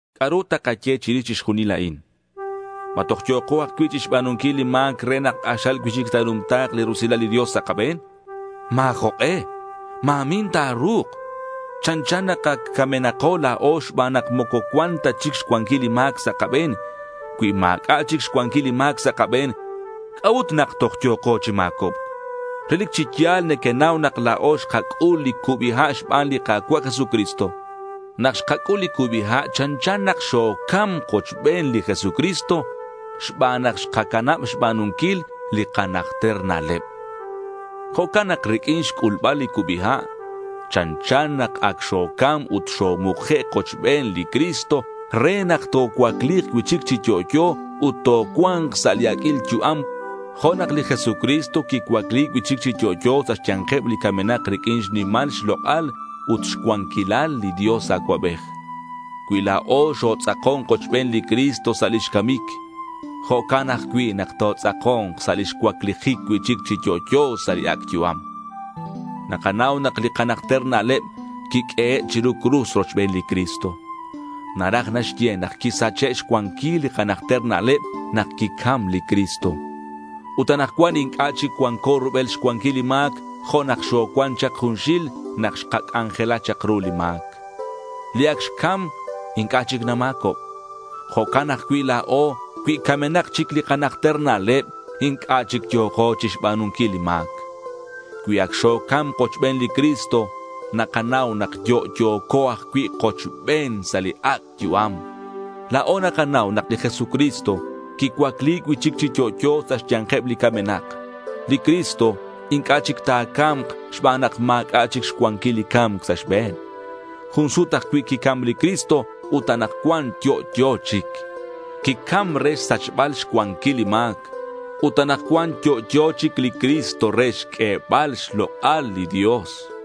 ¿C'a'ru takaye chirix chixjunil a'in? ¿Ma toj yo̱ko ajcui' chixba̱nunquil li ma̱c re nak k'axal cui'chic ta̱numta̱k li rusilal li Dios sa' kabe̱n? ¡Ma̱ jok'e! Ma̱min ta̱ru̱k. Chanchan nak ac camenako la̱o xban nak moco cuan ta chic xcuanquil li ma̱c sa' kabe̱n. Cui ma̱c'a' chic xcuanquil li ma̱c sa' kabe̱n, ¿c'a'ut nak toj yo̱ko chi ma̱cobc? Relic chi ya̱l nequenau nak la̱o xkac'ul li cubi ha' xban nak xkapa̱b li Jesucristo. Nak xkac'ul li cubi ha' chanchan nak xocam kochben li Jesucristo xban nak xkacanab xba̱nunquil li kanajter na'leb. Jo'can nak riq'uin xc'ulbal li cubi ha', chanchan nak ac xocam ut xomuke' kochben li Cristo re nak tocuacli̱k cui'chic chi yo'yo ut tocua̱nk sa' li aq'uil yu'am, jo' nak li Jesucristo quicuacli cui'chic chi yo'yo sa' xya̱nkeb li camenak riq'uin xnimal xlok'al ut xcuanquilal li Dios Acuabej. Cui la̱o xotz'akon kochben li Cristo sa' lix camic, jo'can ajcui' nak totz'ako̱nk sa' lix cuaclijic cui'chic chi yo'yo sa' li ac' yu'am. Nakanau nak li kanajter na'leb quiq'uehe' chiru cruz rochben li Cristo. Naraj naxye nak quisache' xcuanquil li kanajter na'leb nak quicam li Cristo. Ut anakcuan inc'a' chic cuanco rubel xcuanquil li ma̱c jo' nak xocuan chak junxil nak xkac'anjela chak ru li ma̱c. Li ac xcam inc'a' chic nama̱cob. Jo'can ajcui' la̱o cui camenak chic li kanajter na'leb, inc'a' chic yo̱ko chixba̱nunquil li ma̱c. Cui ac xocam kochben li Cristo, nakanau nak yo'yo̱co ajcui' kochben sa' li ac' yu'am. La̱o nakanau nak li Jesucristo quicuacli cui'chic chi yo'yo sa' xya̱nkeb li camenak. Li Cristo inc'a' chic ta̱ca̱mk xban nak ma̱c'a' chic xcuanquil li ca̱mc sa' xbe̱n. Jun sut ajcui' quicam li Cristo ut anakcuan yo'yo chic. Quicam re xsachbal xcuanquil li ma̱c. Ut anakcuan yo'yo chic li Cristo re xq'uebal xlok'al li Dios.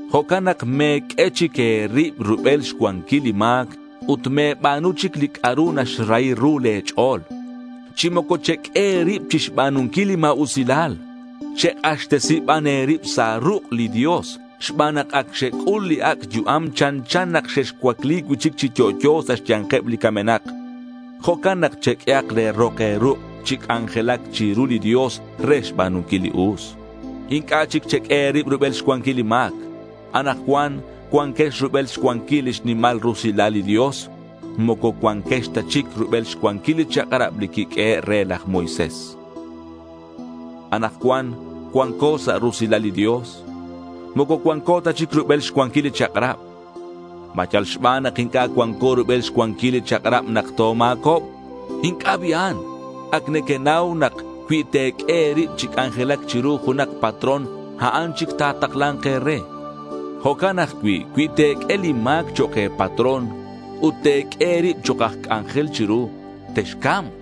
Jo'can nak me̱q'ue chic e̱rib rubel xcuanquil li ma̱c ut me̱ba̱nu chic li c'a'ru naxrahi ru le̱ ch'o̱l. Chi moco cheq'ue e̱rib chixba̱nunquil li ma̱usilal. Chek'axtesi ban e̱rib sa' ruk' li Dios. Xban nak ac xec'ul li ac' yu'am chanchan nak xexcuacli cui'chic chi yo'yo sa' xya̱nkeb li camenak. Jo'can nak cheq'ue le̱ rok e̱ruk' chi c'anjelac chiru li Dios re xba̱nunquil li us. Inc'a' chic cheq'ue e̱rib rubel xcuanquil li ma̱c. Anakcuan cuanquex rubel xcuanquil lix nimal rusilal li Dios. Moco cuanquex ta chic rubel xcuanquil li chak'rab li quiq'uehe' re laj Moisés. Anakcuan cuanco sa' rusilal li Dios. Moco cuanco ta chic rubel xcuanquil li chak'rab. ¿Ma yal xban nak inc'a' cuanco rubel xcuanquil li chak'rab nak toma̱cobk? ¡Inc'a' bi'an! Ac nequenau nak cui te̱q'ue e̱rib chi c'anjelac chiru junak patrón, a'an chic ta̱takla̱nk e̱re. Jo'can ajcui' cui te̱q'ue li ma̱c chok' e̱patrón ut te̱q'ue e̱rib chok' aj c'anjel chiru, texca̱mk.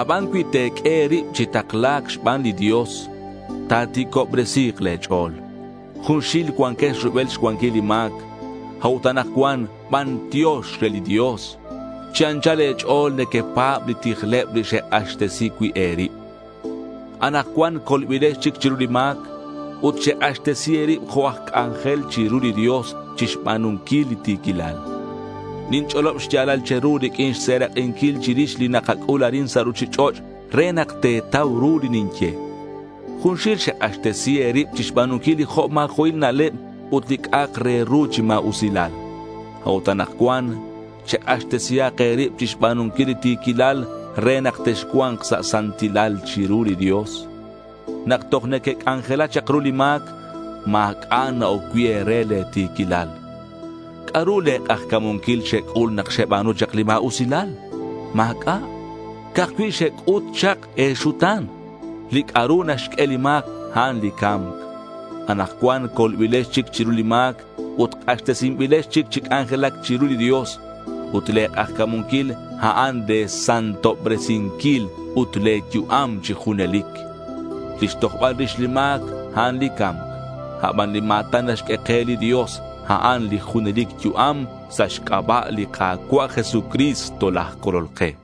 Aban cui te̱q'ue e̱rib chi takla̱c xban li Dios, ta̱ti̱cobresi̱k le̱ ch'o̱l. Junxil cuanquex rubel xcuanquil li ma̱c. A'ut anakcuan, bantiox re li Dios, chi anchal e̱ch'o̱l nequepa̱b li tijleb li xek'axtesi cui' e̱rib. Anakcuan colbilex chic chiru li ma̱c. Ut xek'axtesi e̱rib jo' aj c'anjel chiru li Dios chixba̱nunquil li ti̱quilal. Ninch'olob xya̱lal che̱ru riq'uin xserak'inquil chirix li nakac'ul arin sa' ruchich'och' re nak te̱tau ru li ninye. Junxil xek'axtesi e̱rib chixba̱nunquil li jo' ma̱jo'il na'leb ut li c'a'ak re ru chi ma̱usilal. A'ut anakcuan, chek'axtesihak e̱rib chixba̱nunquil li ti̱quilal re nak texcua̱nk sa' santilal chiru li Dios. Nak toj nequec'anjela chak ru li ma̱c, ma̱c'a' na-oc cui' e̱re li ti̱quilal. ¿C'a'ru le̱ k'ajca̱munquil xec'ul nak xeba̱nu chak li ma̱usilal? Ma̱c'a'. Ca'aj cui' xec'ut chak e̱xuta̱n. Li c'a'ru naxq'ue li ma̱c, a'an li ca̱mc. Anakcuan colbilex chic chiru li ma̱c ut k'axtesinbilex chic chi c'anjelac chiru li Dios. Ut le̱ k'ajca̱munquil a'an le̱ santobresinquil ut le̱ yu'am chi junelic. Lix tojbal rix li ma̱c, a'an li ca̱mc. Aban li ma̱tan naxq'ue ke li Dios, a'an li junelic yu'am sa' xc'aba' li Ka̱cua' Jesucristo laj Colol ke.